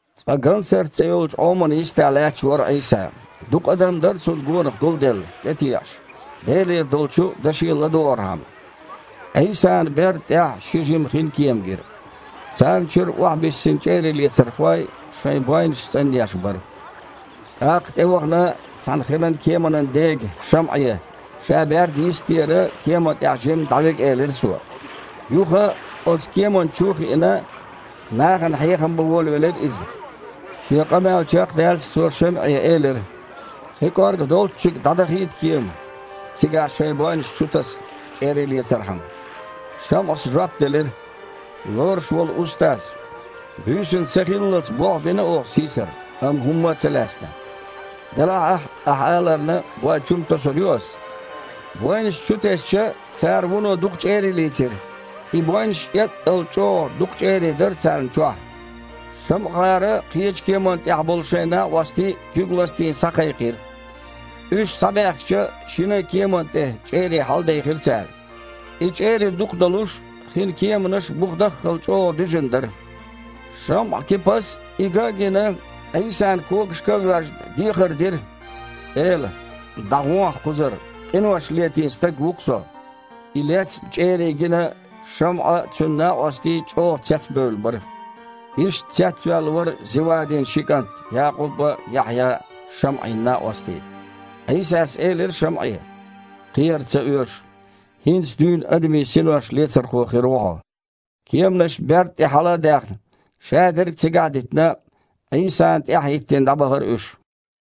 Цкъа Гансарт цІе йолчу Іомана йистехь лаьтташ вара Іийса. Дукха адам дара Цунна гонах гулделла, тІе теІаш, Делера долчу даше ладогІархьама. Іийсана берда тІехь ши жима хинкема гира. Царна чуьра охьабиссина чІерийлецархой шайн бойнаш цІанъеш бара. ТІаккха тІевахана цхьана хинан кеманан дега, ШамІе, Ша берда йистера кеман тІехь жимма дІавига элира Цо. Юха оцу кеманна чу а хиина, нахана хьехам бан волавелира Иза. Шен къамел чекхдаьлча, Цо ШамІе элира: «Хи кІорга долччига дІадахийта кема! Цигахь шайн бойнаш чутаса, чІерий лецархьама!» ШамІас жоп делира: «Лоруш волу Устаз! Буьйсанна сахиллалц болх бина оха сийсара, амма хІумма а ца лаьцна. Делахь а, Ахь аларна, бой чу-м тосур ю ас». Бойнаш чутесча, цара вуно дукха чІерий лийцира. И бойнаш эттІал чІогІа дукха чІерий дара царна чохь. ШамІагІара кхечу кеманна тІехь болу шайн накъостий, куьг а ластийна, схьакхайкхира. Уьш схьабаьхкича, шина а кеманна тІе чІерий хьаладехира цара. И чІерий дукха долуш, хинан кеманаш бухадаххал чІогІа дуьзина дара. ШамІа-Кипас, и ган а гина, Іийсан когашка а воьжна, дехар дира: «Эла! ДІагІохьа кхузара, къинош летийна стаг ву-кх со!» И лецна чІерий гина, ШамІа а, цуьнан накъостий а чІогІа цецбевлла бара. Иштта цецваьлла вара Зевадин ши кІант, Якъуб а, Яхьъя а – ШамІин накъостий. Іийсас элира ШамІе: «Кхера ца оьшу! ХІинца дуьйна адамийн синош лецархо хир ву хьо». Кеманаш берда тІе хьала а даьхна, шадерг цигахь а дитина, Іийсана тІаьхьахІиттина дІабахара уьш.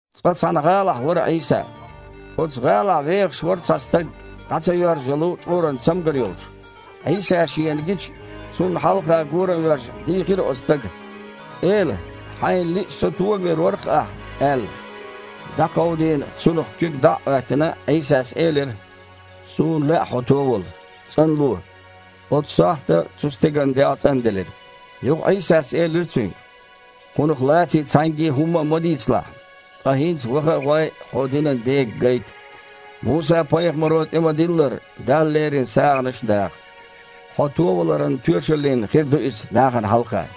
Цкъа цхьана гІалахь вара Іийса. Оцу гІалахь вехаш вара цхьа стаг, дІа ца йоьрзу йолу чкъуран цамгар йолуш. Іийса шена гича, Цунна хьалха гора воьжна, дийхира оцу стага: «Эла! Хьайна лиъча, со товийр вара-кх Ахьа», – аьлла. ДІакховдийна, цунах дІа а Іоьттина, Іийсас элира: «Суна лаьа хьо товала! ЦІанло!» Оцу сохьта цу стеган дегІ цІанделира. Юха Іийсас элира цуьнга: «Кхунах лаций цхьаьнгге хІумма а ма дийцалахь. Ткъа хІинца ваха а гІой, хьо динан дега гайта. Муса-пайхамаро тІе ма-диллара, Далла лерина сагІанаш даха. Хьо товаларан тоьшаллина хир ду иза нахана хьалха».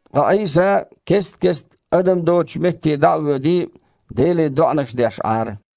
Ткъа Іийса кест-кеста адам доцучу метте дІа а воьдий, Деле доІанаш деш Іара.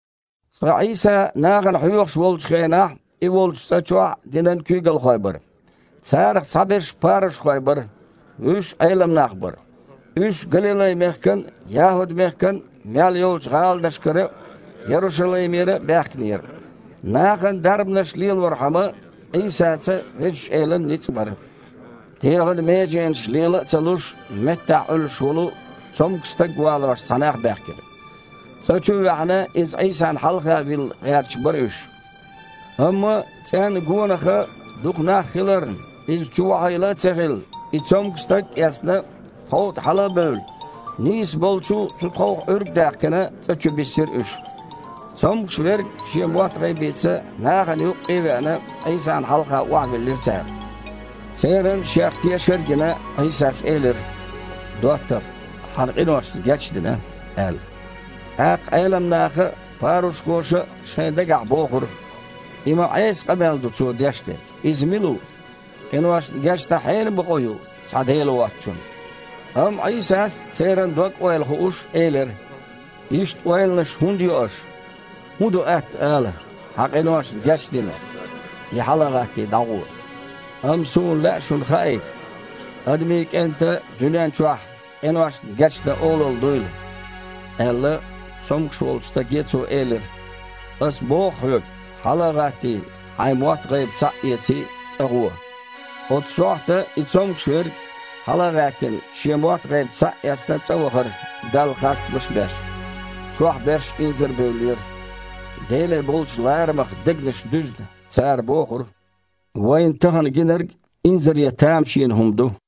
Цкъа Іийса нахана хьоьхуш волчу хенахь, И волчу цІа чохь динан куьйгалхой бара. Царах цхьаберш парушхой бара, вуьш Іелам нах бара. Уьш Галилай-мехкан а, ЯхІуд-мехкан а мел йолчу гІаланашкара а, Ярушалаймера а баьхкинера. Нахана дарбанаш лелорхьама, Іийсаца Везачу Элан ницкъ бара. ДегІан меженаш лела а ца луш, меттахь Іуьллуш волу цомгуш стаг валош цхьа нах баьхкира. ЦІа чу а ваьхьна, иза Іийсана хьалха вилла гІерташ бара уьш. Амма цІенна гонахьа дукха нах хиларна, иза чувохьийла а ца хилла, и цомгуш стаг а эцна, тхов тІе хьала а бевлла, нийса болчу цу тховх Іуьрг а даьккхина, цІа чу биссира уьш. Цомгуш верг шен мотт-гІайбица нахана юккъе а веана, Іийсана хьалха охьавиллира цара. Церан Шех тешар а гина, Іийсас элира: «ДоттагІа! Хьан къиношна гечдина», – аьлла. ТІаккха Іелам наха а, парушхоша а шайн дагахь бохура: «И ма Іеса къамел ду Цо деш дерг. Иза мила ву? Къиношна гечдан хьенан бакъо ю, цхьа Дела воцучун?» Амма Іийсас, церан дог-ойла хууш, элира: «Иштта ойланаш хІунда йо аш? ХІун ду атта ала: „Хьан къиношна гечдина“, я „Хьала а гІаттий, дІагІо“? Амма Суна лаьа шуна хаийта Адамийн КІентан дуьнен чохь къиношна гечдан олалла дуйла», – аьлла, цомгуш волчу стаге Цо элира: «Ас боху хьоьга, хьала а гІаттий, хьайн мотт-гІайба схьа а эций, цІа гІуо!» Оцу сохьта и цомгуш верг, хьала а гІаьттина, шен мотт-гІайба схьа а эцна, цІа вахара, Далла хастамаш а беш. Чохь берш инзарбевллера. Деле болчу ларамах дегнаш дуьзна, цара бохура: «Вайна тахана гинарг инзаре тамашийна хІума ду!»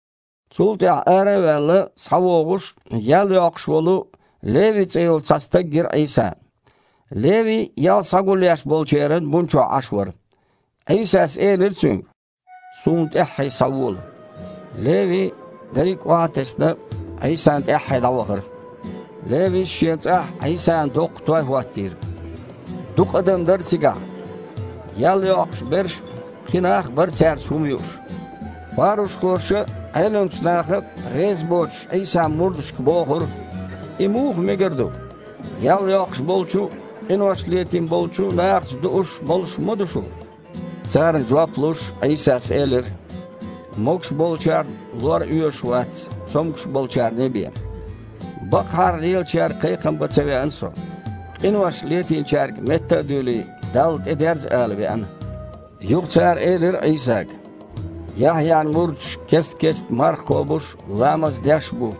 Цул тІаьхьа, ара а ваьлла, схьавогІуш, ял йоккхуш волу, Леви цІе йолу цхьа стаг гира Іийсана. Леви ял схьагулъеш болчеран бун чохь Іаш вара. Іийсас элира цуьнга: «Суна тІаьххье схьавола!» Леви, дерриг охьа а тесна, Іийсана тІаьххье дІавахара. Левис шен цІахь Іийсана доккха той хІоттийра. Дукха адам дара цигахь. Ял йоккхуш берш а, кхин нах а бара цаьрца хІума юуш. Парушхоша а, Іеламчу наха а, резабоцуш, Іийсан мурдашка бохура: «И муха мегар ду? Ял йоккхуш болчу а, къинош летийна болчу а нахаца дууш, молуш ма ду шу?» Царна жоп луш, Іийсас элира: «Могуш болчарна лор оьшуш вац, цомгуш болчарний бен. Бакъахьара лелачаьрга кхайкхам бан ца веана Со, къинош летийначаьрга метта а дуьйлий, Далла тІедерза ала веана». Юха цара элира Іийсага: «Яхьъян мурдаш кест-кеста марха кхобуш а, ламаз деш а бу,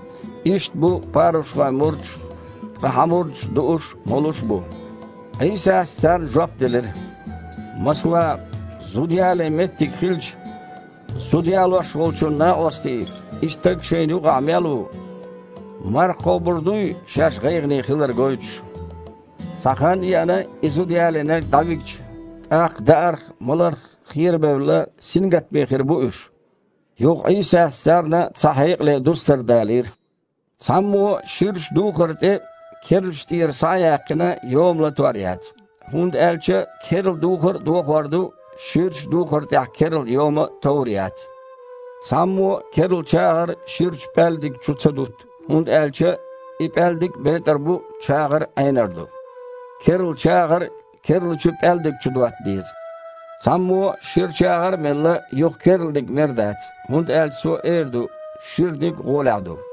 иштта бу парушхойн мурдаш а, ткъа Хьан мурдаш дууш а, молуш а бу». Іийсас царна жоп делира: «Масала, зуда ялийна меттиг хилча, зуда ялош волчун накъостий, и стаг шайна юкъахь мел ву, марха кхобур дуй, шаьш гІайгІане хилар гойтуш? Цхьа хан а еана, и зуда ялийнарг дІавигча, тІаккха даарх, маларх херабевлла, сингаттаме хир бу уьш». Юха Іийсас царна цхьа хьекъале дустар далийра: «Цхьаммо а ширачу духар тІе, керлачу тІера схьа а яьккхина, йома латор яц, хІунда аьлча керла духар а дохор ду, ширачу духар тІехь керла йома товр яц. Цхьаммо а керла чагІар ширачу пІаьлдиг чу ца дутту, хІунда аьлча и пІаьлдиг а бетІар бу, чагІар а Іенар ду. Керла чагІар керлачу пІаьлдиг чу дотта деза. Цхьаммо а шира чагІар а мелла, юха керланиг мер дац, хІунда аьлча цо эр ду: „Шираниг гІолехь ду“».